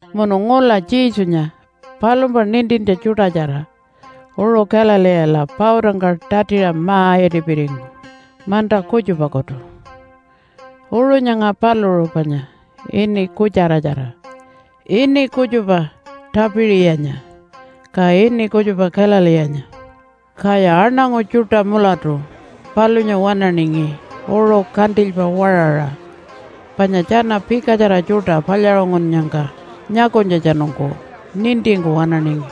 Munu ngula Jesunya palumpa nintintja tjuṯatjara uṟu Galileela pautangka tatiṟa ma-itipiringu manta kutjupakutu. (Uṟu nyanga paluṟu panya ini kutjaratjara, ini kutjupa Tapiṟiyanya, ka ini kutjupa Galileenya). Kaya aṉangu tjuṯa mulatu palunya waṉaningi uṟu kantilypa waṟaṟa panya tjana pikatjara tjuṯa palyaṟungunnyangka nyakunytjatjanungku nintingku waṉaningi.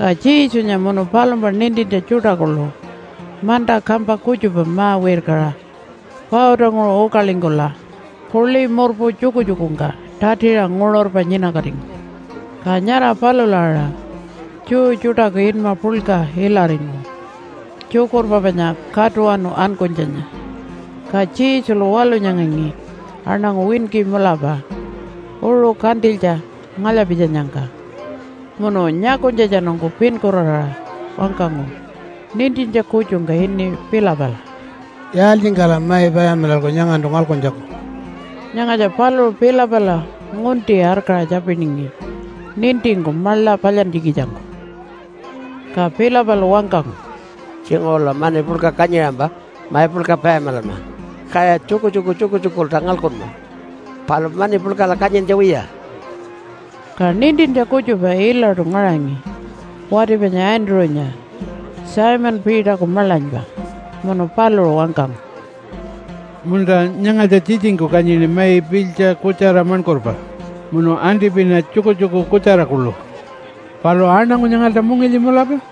Ka Jesunya munu palumpa nintintja tjuṯa kuḻu manta kampa kutjupa ma-wirkaṟa pautanguṟu ukalingkula puḻi murpu tjukutjukungka tatiṟa nguṟurpa nyinakatingu. (Ka nyara palula aṟa Jew tjuṯaku inma puḻka ilaringu tjukurpa panya Katuwanu Ankunytjanya.) Ka Jesulu walunyangangi aṉangu winki mulapa uṟu kantilytja ngalya-pitjanyangka, munu nyakunytjatjanungku pinkuraraṟa wangkangu nintintja kutjungka ini Philipala, “Yaaltjingkala mai payamilalku nyangantu ngalkuntjaku?” (Nyangatja paluṟu Philipala ngunti arkaṟa tjapiningi, nintingku maḻa palyantjikitjangku.) Ka Philipalu wangkangu, “Tjinguṟula mani puḻka kanyiṟampa mai puḻka payamilanma, kaya tjukutjuku tjukutjukulta ngalkunma. Palu mani puḻkala kanyintja wiya.” Ka nintintja kutjupa ilaṯu ngaṟangi wati panya Andrew-nya, Simon Peterku maḻanypa. Munu paluṟu wangkangu, “Munta, nyangatja tjitjingku kanyini mai pilytja kutjara maṉkurpa munu antipina tjukutjuku kutjara kuḻu. Palu aṉangu nyangalta mungilyi mulapa.”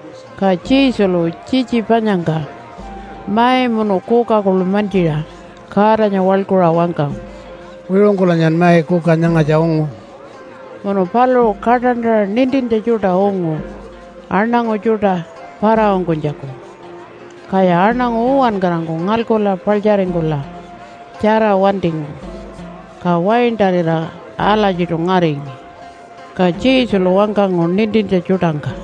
Ka Jesulu tjitji panyangka mai munu kuka kuḻu mantjiṟa Godanya waḻkuṟa wangkangu, “Wiṟungkulanyan mai kuka nyangatja ungu.” Munu paluṟu kaṯantaṟa nintintja tjuṯa ungu aṉangu tjuṯa para-ungkunytjaku. Kaya aṉangu uwankarangku ngalkula paḻtjaringkula tjara wantingu, ka waintarira alatjiṯu ngaringi. Ka Jesulu wangkangu nintintja tjuṯangka,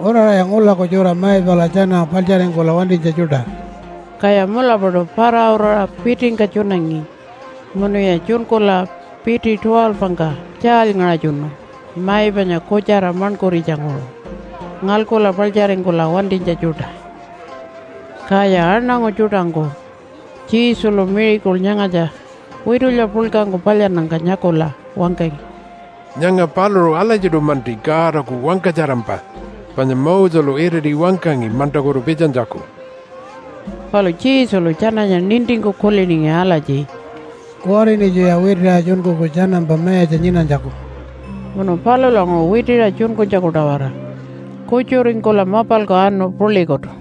“Uraṟaya ngulaku tjura mai pala tjana paḻtjaringkula wantinytja tjuṯa.” Kaya mulapaṯu para-uraṟa pitingka tjunangi munuya tjunkula piti 12-ngka tjaalyngaṟatjunu mai panya kutjara maṉkuritjanguṟu ngalkula paḻtjaringkula wantinytja tjuṯa. Kaya aṉangu tjuṯangku Jesulu miracle nyangatja witulya puḻkangku palyannyangka nyakula wangkangi, “Nyanga paluṟu alatjiṯu-manti Godaku wangkatjarampa, panya Moselu iriti wangkangi mantakutu pitjanytjaku.” Palu Jesulu tjananya nintingku kuliningi alatji, “Kuwariṉitjuya witiṟa tjunkuku tjanampa mayatja nyinanytjaku.” Munu palulanguṟu witiṟa tjunkunytjaku-tawara kutjuringkula mapalku anu puḻikutu.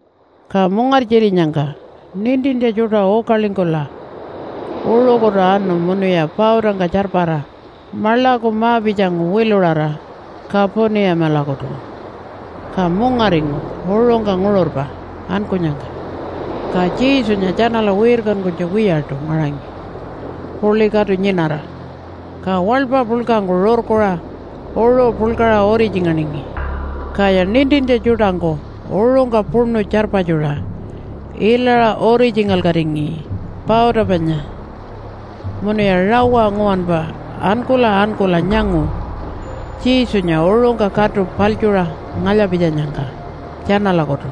Ka mungartjirinyangka nintintja tjuṯa ukalingkula uṟukutu anu munuya pautangka tjarpara maḻaku ma-pitjangu wiluṟara Kapunimalakutu. Ka mungaringu uṟungka nguṟurpa ankunyangka, ka Jesunya tjanala wirkankunytja wiyaṯu ngaṟangi puḻi katu nyinara. Ka waḻpa puḻkangku rurkuṟa uṟu puḻkaṟa uritjinganingi. Kaya nintintja tjuṯangku uṟungka puṉu tjarpatjuṟa ilaṟa uritjingalkatingi pauta panya, munuya rawa nguwanpa ankula ankula nyangu Jesunya uṟungka katu paḻtjuṟa ngalya-pitjanyangka tjanalakutu.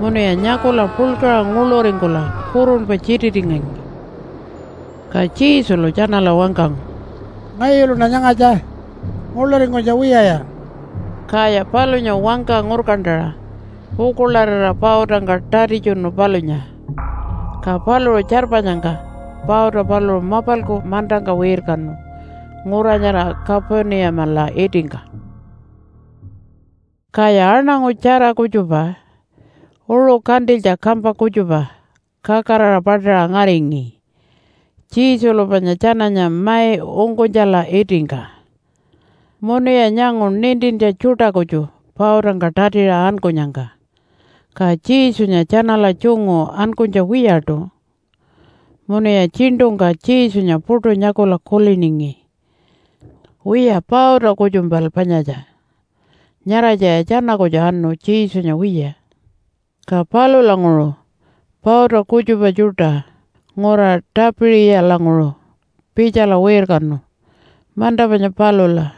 Munuya nyakula puḻkaṟa nguḻuringkula kurunpa tjititingangi. Ka Jesulu tjanala wangkangu, “Ngayuluṉa nyangatja! Nguḻuringkunytja wiyaya!” Kaya palunya wangka ngurkantaṟa pukuḻarira pautangka tatitjunu palunya. Ka paluṟu tjarpanyangka pauta paluṟu mapalku mantangka wirkanu ngura nyara Kapunimala itingka. Kaya aṉangu tjara kutjupa uṟu kantilytja kampa kutjupa kakaraṟa paṯaṟa ngaringi Jesulu panya tjananya mai ungkunytjala itingka. Munuya nyangu nintintja tjuṯa kutju pautangka tatiṟa ankunyangka, ka Jesunya tjanala tjungu ankunytja wiyaṯu. Munuya tjiṉṯungka Jesunya puṯu nyakula kuliningi, “Wiya pauta kutjumpal panyatja. Nyaratjaya tjana kutju anu, Jesunya wiya.” Ka palulanguṟu pauta kutjupa tjuṯa ngura Tapiṟiyalanguṟu pitjala wirkanu manta panya palula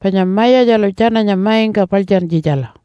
panya Mayatjalu tjananya maingka paḻtjantjitjala.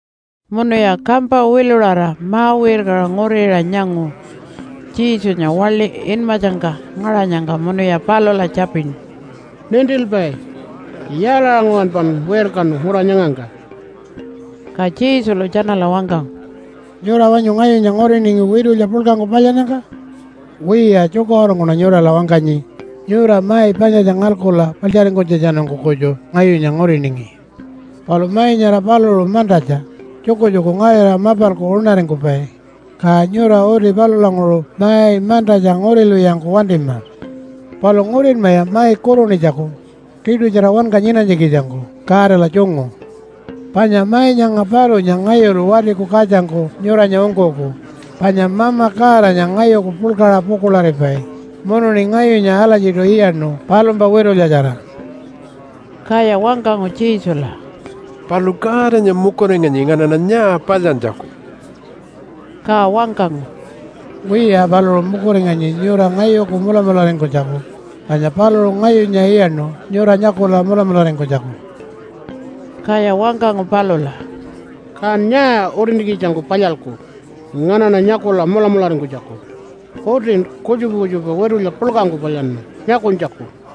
Munuya kampa wiluṟara ma-wirkaṟa nguriṟa nyangu Jesunya waḻi inmatjangka ngaṟanyangka munuya palula tjapinu, “Nintilpai! Yaalaṟa nguwanpan wirkanu ngura nyangangka?” Ka Jesulu tjanala wangkangu, “Nyura wanyu ngayunya nguriningi witulya puḻkangku palyannyangka? Wiya, tjukaṟurungkuṉa nyurala wangkanyi, nyura mai panyatja ngalkula paḻtjaringkunytjatjanungku kutju ngayunya nguriningi. Palu mai nyara paluṟu mantatja, tjukutjuku ngarira mapalku uṉaringkupai, ka nyura uti palulanguṟu mai mantatja ngurilwiyangku wantima. Palu ngurinmaya mai kurunitjaku tiṯutjara wanka nyinanytjikitjangku Godala tjungu. Panya mai nyanga palunya ngayulu Watiku Katjangku nyuranya ungkuku, panya Mama Godanya ngayuku puḻkaṟa pukuḻaripai munuṉi ngayunya alatjiṯu iyaṉu palumpa witulyatjara.” Kaya wangkangu Jesula, “Palu Godanya mukuringanyi nganaṉa nyaa palyantjaku?” Ka wangkangu, “Wiya, paluṟu mukuringanyi nyura ngayuku mulamularingkunytjaku, panya paluṟu ngayunya iyaṉu nyura nyakula mulamularingkunytjaku.” Kaya wangkangu palula, “Kan nyaa utintjikitjangku palyalku nganaṉa nyakula mulamularingkunytjaku? Utin kutjupa kutjupa witulya puḻkangku palyanma nyakunytjaku.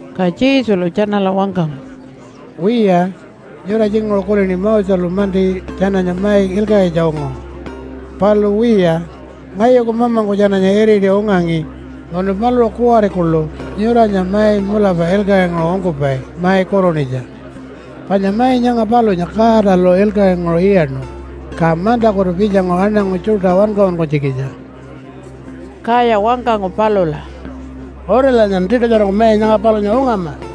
Ka Jesulu tjanala wangkangu, “Wiya, nyura tjinguṟu kulini Moselu-manti tjananya mai ilkaṟitja ungu. Palu wiya, ngayuku Mamangku tjananya iriti ungangi, munu paluṟu kuwari kuḻu nyuranya mai mulapa ilkaṟinguṟu ungkupai mai kurunitja. Panya mai nyanga palunya Godalu ilkaṟinguṟu iyaṉu, ka mantakutu pitjangu aṉangu tjuṯa wankaṟunkunytjikitja.” Kaya wangkangu palula, “Utilanyan tiṯutjarangku mai nyanga palunya ungama.”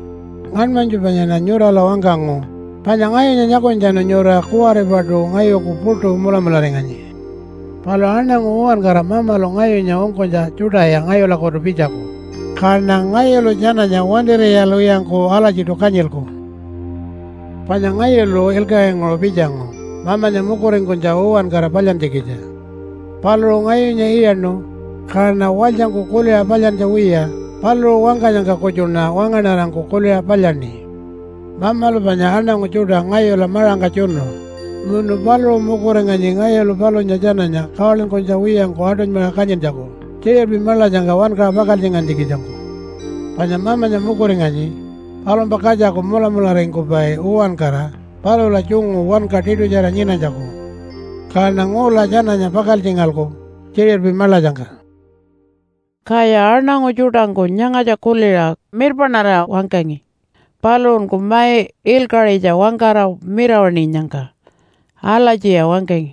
“Ngaṉmanytju panyaṉa nyurala wangkangu, panya ngayunya nyakunytjatjanu nyura kuwaripaṯu ngayuku puṯu mulamularinganyi. Palu aṉangu uwankara Mamalu ngayunya ungkunytja tjuṯaya ngayulakutu pitjaku, kaṉa ngayulu tjananya wantir'iyalwiyangku alatjiṯu kanyilku. “Panya ngayulu ilkaṟinguṟu pitjangu Mamanya mukuringkunytja uwankara palyantjikitja. Paluṟu ngayunya iyaṉu, kaṉa walytjangku kuliṟa palyantja wiya paluṟu wangkanyangka kutjuṉa wangaṉarangku kuliṟa palyaṉi. Mamalu panya aṉangu tjuṯa ngayula maṟangka tjunu munu paluṟu mukuringanyi ngayulu palunya tjananya kawalinkunytja wiyangku aṯunymaṟa kanyintjaku tjiṟirpi maḻatjangka wankaṟa pakaltjingantjikitjangku. Panya Mamanya mukuringanyi palumpa katjaku mulamularingkupai uwankara palula tjungu wanka tiṯutjara nyinanytjaku. Kaṉa ngula tjananya pakaltjingalku tjiṟirpi maḻatjangka.” Kaya aṉangu tjuṯangku nyangatja kuliṟa mirpaṉarira wangkangi, paluṟunku mai ilkaṟitja wangkara mirawaṉinyangka. Alatjiya wangkangi,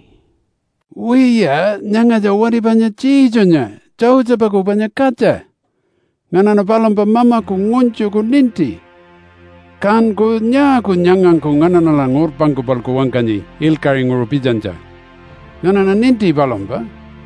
“Wiya, nyangatja wati panya Jesunya Josephaku panya katja. Nganaṉa palumpa mamaku ngunytjuku ninti. Kanku nyaaku nyangangku nganaṉala ngurpangka-palku wangkanyi ilkaṟinguṟu pitjanytja? Nganaṉa ninti palumpa.”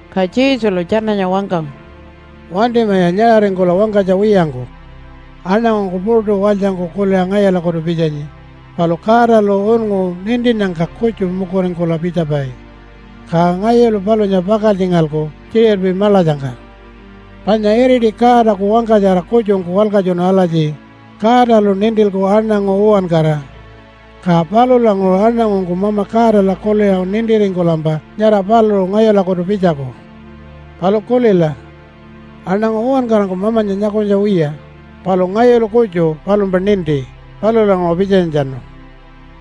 Ka Jesulu tjananya wangkangu, “Wantimaya nyaṟaringkula wangkanytja wiyangku! Aṉangungku puṯu walytjangku kuliṟa ngayulakutu pitjanyi, palu Godalu unngu nintinnyangka kutju mukuringkula pitjapai. Ka ngayulu palunya pakaltjingalku tjiṟirpi maḻatjangka. Panya iriti Godaku wangkatjara kutjungku walkatjunu alatji, ‘Godalu nintilku aṉangu uwankara.’ Ka palulanguṟu aṉangungku Mama Godala kuliṟa nintiringkulampa nyara paluṟu ngayulakutu pitjaku. Palu kulila! Aṉangu uwankarangku Mamanya nyakunytja wiya, palu ngayulu kutju palumpa ninti, palulanguṟu pitjanytjatjanu.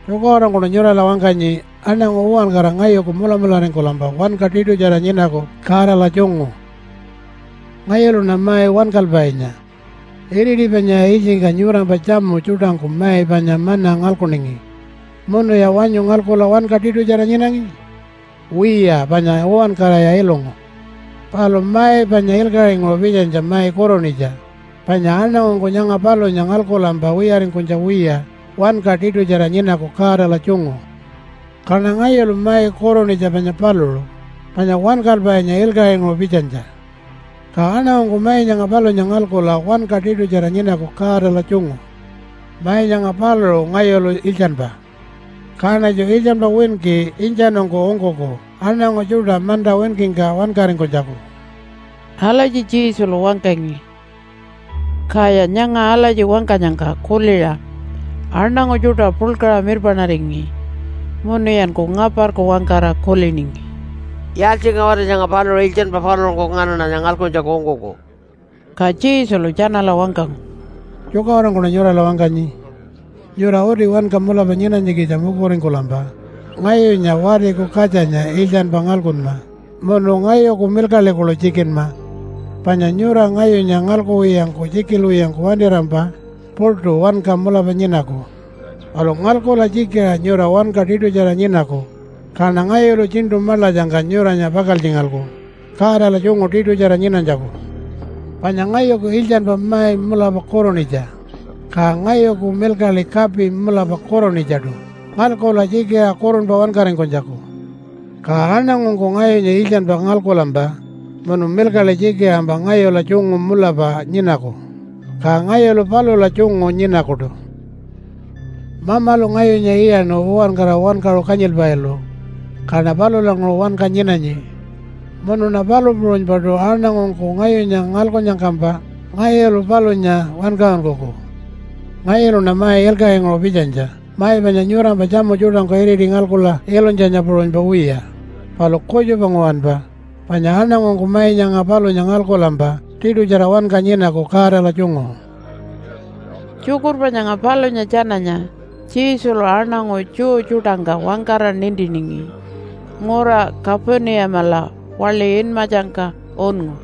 Tjukaṟurungkuṉa nyurala wangkanyi, aṉangu uwankara ngayuku mulamularingkulampa wanka tiṯutjara nyinaku Godala tjungu. “Ngayuluṉa mai wankalpainya. Iriti panyaya ilytjingka nyurampa tjamu tjuṯangku mai panya manna ngalkuningi. Munuya wanyu ngalkula wanka tiṯutjara nyinangi? Wiya panya uwankaraya ilungu. Palu mai panya ilkaṟinguṟu pitjanytja mai kurunitja, panya aṉangungku nyanga palunya ngalkulampa wiyaringkunytja wiya wanka tiṯutjara nyinaku Godala tjungu. Kaṉa ngayulu mai kurunitja panya paluṟu, panya wankalpainya ilkaṟinguṟu pitjanytja. Ka aṉangungku mai nyanga palunya ngalkula wanka tiṯutjara nyinaku Godala tjungu. Mai nyanga paluṟu ngayulu iltjanpa. Kaṉatju iltjanpa winki intjanungku ungkuku aṉangu tjuṯa manta winkingka wankaringkunytjaku.” Alatji Jesulu wangkangi. Kaya nyanga alatji wangkanyangka kuliṟa aṉangu tjuṯa puḻkaṟa mirpaṉaringi munuyanku ngaparku wangkara kuliningi, “Yaaltjingaṟa wati nyanga paluṟu iltjanpa paluṟunku nganaṉanya ngalkuntjaku ungkuku?” Ka Jesulu tjanala wangkangu, “Tjukaṟurungkuṉa nyurala wangkanyi. Nyura uti wanka mulapa nyinanytjikitja mukuringkulampa ngayunya Watiku Katjanya iltjanpa ngalkunma munu ngayuku milkaḻi kuḻu tjikinma. Panya nyura ngayunya ngalkuwiyangku tjikilwiyangku wantirampa puṯu wanka mulapa nyinaku. Palu ngalkula tjikiṟa nyura wanka tiṯutjara nyinaku, kaṉa ngayulu tjiṉṯu maḻatjangka nyuranya pakaltjingalku Godala tjungu tiṯutjara nyinanytjaku. Panya ngayuku iltjanpa mai mulapa kurunitja, ka ngayuku milkaḻi kapi mulapa kurunitjaṯu ngalkula tjikiṟa kurunpa wankaringkunytjaku. Ka aṉangungku ngayunya iltjanpa ngalkulampa munu milkaḻi tjikiṟampa ngayula tjungu mulapa nyinaku, ka ngayulu palula tjungu nyinakuṯu. “Mamalu ngayunya iyaṉu uwankara wankaṟu kanyilpailu, kaṉa palulanguṟu wanka nyinanyi. Munuṉa palu puṟunypaṯu aṉangungku ngayunya ngalkunnyangkampa ngayulu palunya wankaṟunkuku. Ngayuluṉa mai ilkaṟinguṟu pitjanytja mai panya nyurampa tjamu tjuṯangku iriti ngalkula ilunytjanya puṟunypa wiya, palu kutjupa nguwanpa, panya aṉangungku mai nyanga palunya ngalkulampa tiṯutjara wanka nyinaku Godala tjungu.” Tjukurpa nyanga palunya tjananya Jesulu aṉangu Jew tjuṯangka wangkara nintiningi ngura Kapunimala waḻi inmatjangka unngu.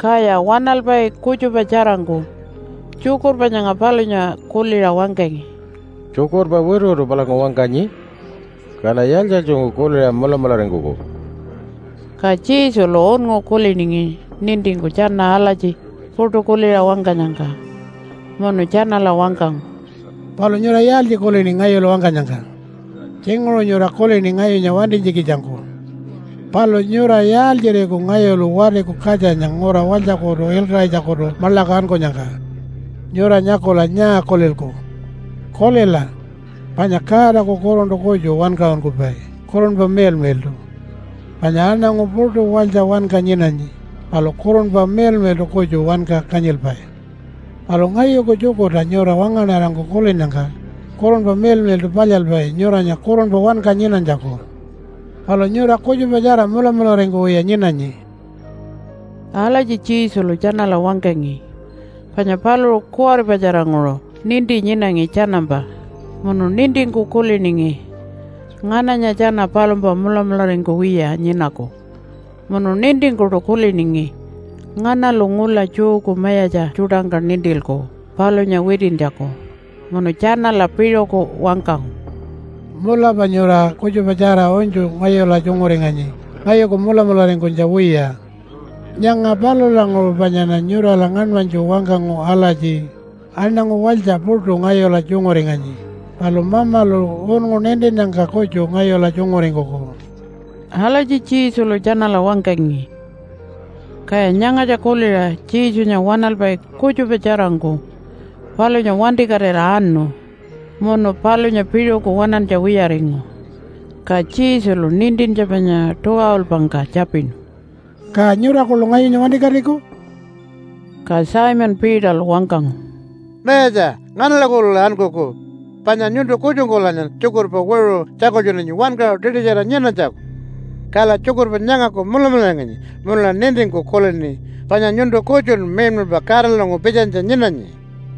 Kaya waṉalpai kutjupa tjarangku tjukurpa nyanga palunya kuliṟa wangkangi, “Tjukurpa wituwitu palangku wangkanyi. Kala yaaltji-yaaltjingku kuliṟa mulamularingkuku?” Ka Jesulu unngu kuliningi nintingku tjana alatji puṯu kuliṟa wangkanyangka. Munu tjanala wangkangu, “Palu nyura yaaltji kulini ngayulu wangkanyangka? Tjinguṟu nyura kulini ngayunya wantinytjikitjangku. Palu nyura yaaltjiriku ngayulu Watiku Katjanya ngura walytjakutu ilkaṟitjakutu maḻaku ankunyangka? Nyura nyakula nyaa kulilku? Kulila, panya Godaku Kuruntu kutju wankaṟunkupai, Kurunpa Miḻmiḻṯu. Panya aṉangu puṯu walytja wanka nyinanyi palu Kurunpa Miḻmiḻṯu kutju wanka kanyilpai. Palu ngayuku tjukurta nyura wangaṉarangku kulinnyangka Kurunpa Miḻmiḻṯu palyalpai nyuranya kurunpa wanka nyinanytjaku. Palu nyura kutjupatjara mulamularingkuwiya nyinanyi.” (Alatji Jesulu tjanala wangkangi panya paluṟu kuwaripatjaranguṟu ninti nyinangi tjanampa munu nintingku kuliningi ngananya tjana palumpa mulamularingkuwiya nyinaku, munu nintingkuṯu kuliningi nganalu ngula Jewku mayatja tjuṯangka nintilku palunya witintjaku.) Munu tjanala piṟuku wangkangu, “Mulapa nyura kutjupatjara unytju ngayula tjunguringanyi ngayuku mulamularingkunytja wiya. Nyanga palulanguṟu panyaṉa nyurala ngaṉmanytju wangkangu alatji, ‘Aṉangu walytja puṯu ngayula tjunguringanyi, palu Mamalu unngu nintinnyangka kutju ngayula tjunguringkuku.’” Alatji Jesulu tjanala wangkangi. Kaya nyangatja kuliṟa Jesunya waṉalpai kutjupa tjarangku palunya wantikatira anu munu palunya piṟuku waṉantja wiyaringu. Ka Jesulu nintintja panya 12-ngka tjapinu, “Ka nyura kuḻu ngayunya wantikatiku?” Ka Simon Peterlu wangkangu, “Mayatja, nganalakutula ankuku? Panya nyuntu kutjungkulanyan tjukurpa wiṟu tjakultjunanyi wankaṟu tiṯutjara nyinanytjaku. Kala tjukurpa nyangaku mulamularinganyi munula nintingku kulini panya nyuntu kutjun miḻmiḻpa Godalanguṟu pitjanytja nyinanyi.”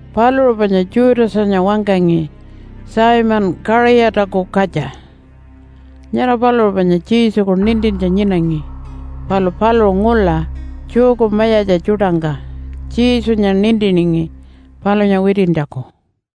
(Paluṟu panya Judasanya wangkangi Simon Kaṟiyataku katja. Nyara paluṟu panya Jesuku nintintja nyinangi, palu paluṟu ngula Jewku mayatja tjuṯangka Jesunya nintiningi palunya witintjaku.)